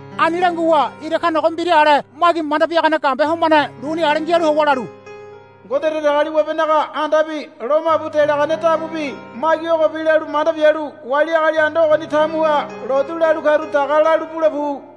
Ani languwa ira kanogo mbira ale magi manda biagane gambe homane luni ale ngialu howa lalu, Ngode Datagaliwabenaga andabi lomabu delagane dabubi magi ogobi lalu manda bialu wali agali anda ogoni tamuha lotu lalu karu daga lalu bule pu.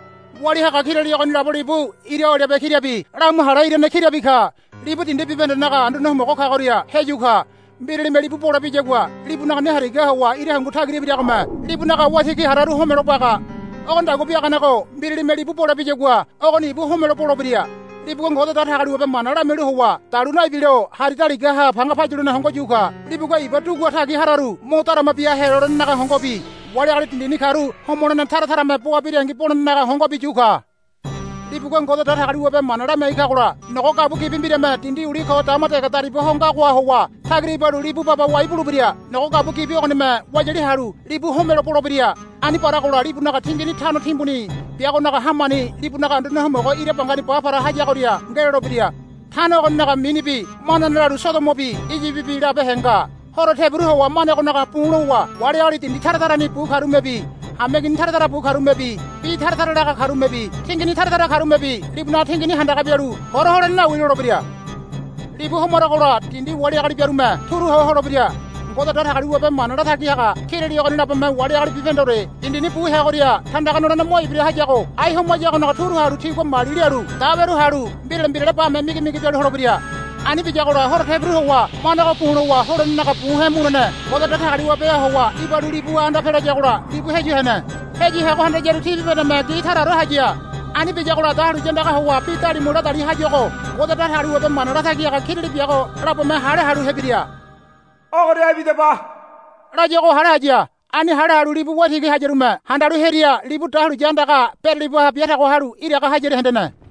Walia haga kirali ogonilabo libu ira olibe kirabi lamu hale irane kirabi ka. Libu dindi bibahendenaga Anduane Homogo kagoria heyu ka. Mbiralime libu bole biyagua libunaga ne harigaha howa ira hungu tagira ibiragome libunaga waitigi hararu homelo baga. Ogonidagua biaganego mbiralime libu bole biyagua ogoni ibu homelo bolebira. Libugua Ngode Datagaliwabe mana lamialu howa dalu naibilo hari daligaha panga payulene hongo yu ka. Libugua iba dugua tagi hararu mo darama bia helolenenaga hongobi wali agali dindini karu homolene tara tarame boa birangi bolenenaga hongobi yu ka. Libugua Ngode Datagaliwabe mana lamiai kagola nogo gabua gibi mbirame dindi uli ko dama dege dariba ho ngagoha howa tagira ibalu libu baba wai bulebira. Nogo gabua gibi ogonime wayali halu libu homelo bolebira. Ani baragola libunaga tingini tano timbuni biagonaga hamani libunaga Anduane Homogo ira bangani ba para hayagoria ngelolebira. Tano ogoninaga mini bi manane lalu Sodomobi Iyibibi labehe nga. Horo tebiru howa manegonaga bu̱ lowa wali agali dindi tara tarani bu karumebi hameigini tara tara bu karumebi bi tara tara laga karumebi tingini tara tara karumebi libunaga tingini handaga bialu, Hora holene nawi, lolebira. Libu homaragola dindi wali agali biarume turu ho holebira. Ngode Datagaliwabe mana latagi haga kirali ogoni labome wali agali bibahendeore dindini bu heagoria tandaga nolene mo ibira hayago ai homayagonaga turu halu tigua mali lialu daweru halu mbirale mbirale bame migimigi bialu holebira. Ani biyagola horo tebiru howa manego bu̱ lowa holenenaga bu he̱ mulene Ngode Datagaliwabeha howa ibalu libuha anda pelayagola libu heyu hene. Heyu heago handayaru ti bibahendeme gi taraore haya. Ani biyagola dahuliya andaga howa bi dalimu ladali hayuago Ngode Datagaliwabe mana latagi haga kirali biago labome hale halu hebiria, Ogoria ibidaba, layuago hale haya. Ani hale halu libu waitigi hayarume handalu hearia libu dahuliya andaga beralibaha biatago halu iraga hayaria hendene.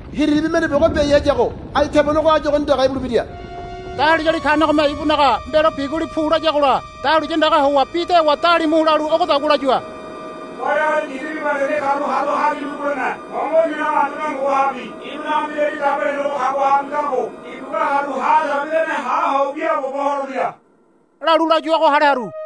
Hiriribi mende biago biai hayago ai tebonego áyu ogoni dege ibulebira. Dahuliyali kanegome ibunaga mbelo biguli pu layagola dahuliya andaga howa bi dewa dalimu lalu ogodagua layua, Wali agali dindi bibahendeni karu haru hagimbu bulene hongo inanaga Anduane Homogohabi ibunaga Mbirali Dabo helenego kagohabi ngago ibugua haru ha dege bidane ha ho wiaabobo holebira, lalu layuago hale haru.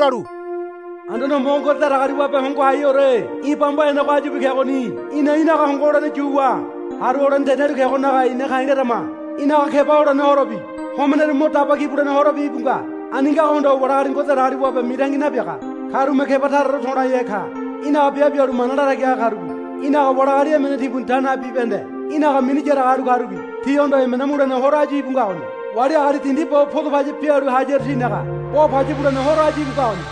lalu, Anduane Homogo Ngode Datagaliwabe Hongo Haiheore í̠ bamba henego áyubi kegoni. Í̠na í̠naga hongo holene yuwa haru holene tenialu kegonaga ina ka̱i̱ larama. Í̠naga keba holene horobi homeneru mo daba ki bulene horobi íbu nga. Ani ngago hondowa wali agali Ngode Datagaliwabe mitangi nabiaga karume keba taraore to̱laihe ka. Í̠naga biabe bialu mana latagi haga karubi í̠naga wali agali emene timbuni ta nabi bibahende í̠naga mini yaraga halu karubi tihondo emena mulene horo áyu íbu ngagoni. Wali agali dindi bo poda paya bialu hayaru tinaga bo paya bulene horo áyu íbu ngagoni,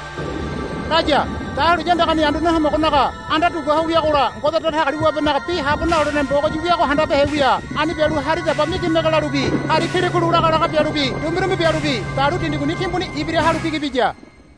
laya. Dahuliya andagani Anduane Homogonaga anda dugua ho wiagola Ngode Datagaliwabenaga Bi Habo Nalolene Mbogoyi wiago handabehe wia. Ani bialu hari daba migimege lalubi hari kilikulu lagalaga bialubi dumbirumbi bialubi dalu dindi guni timbuni ibira halu bigi biya.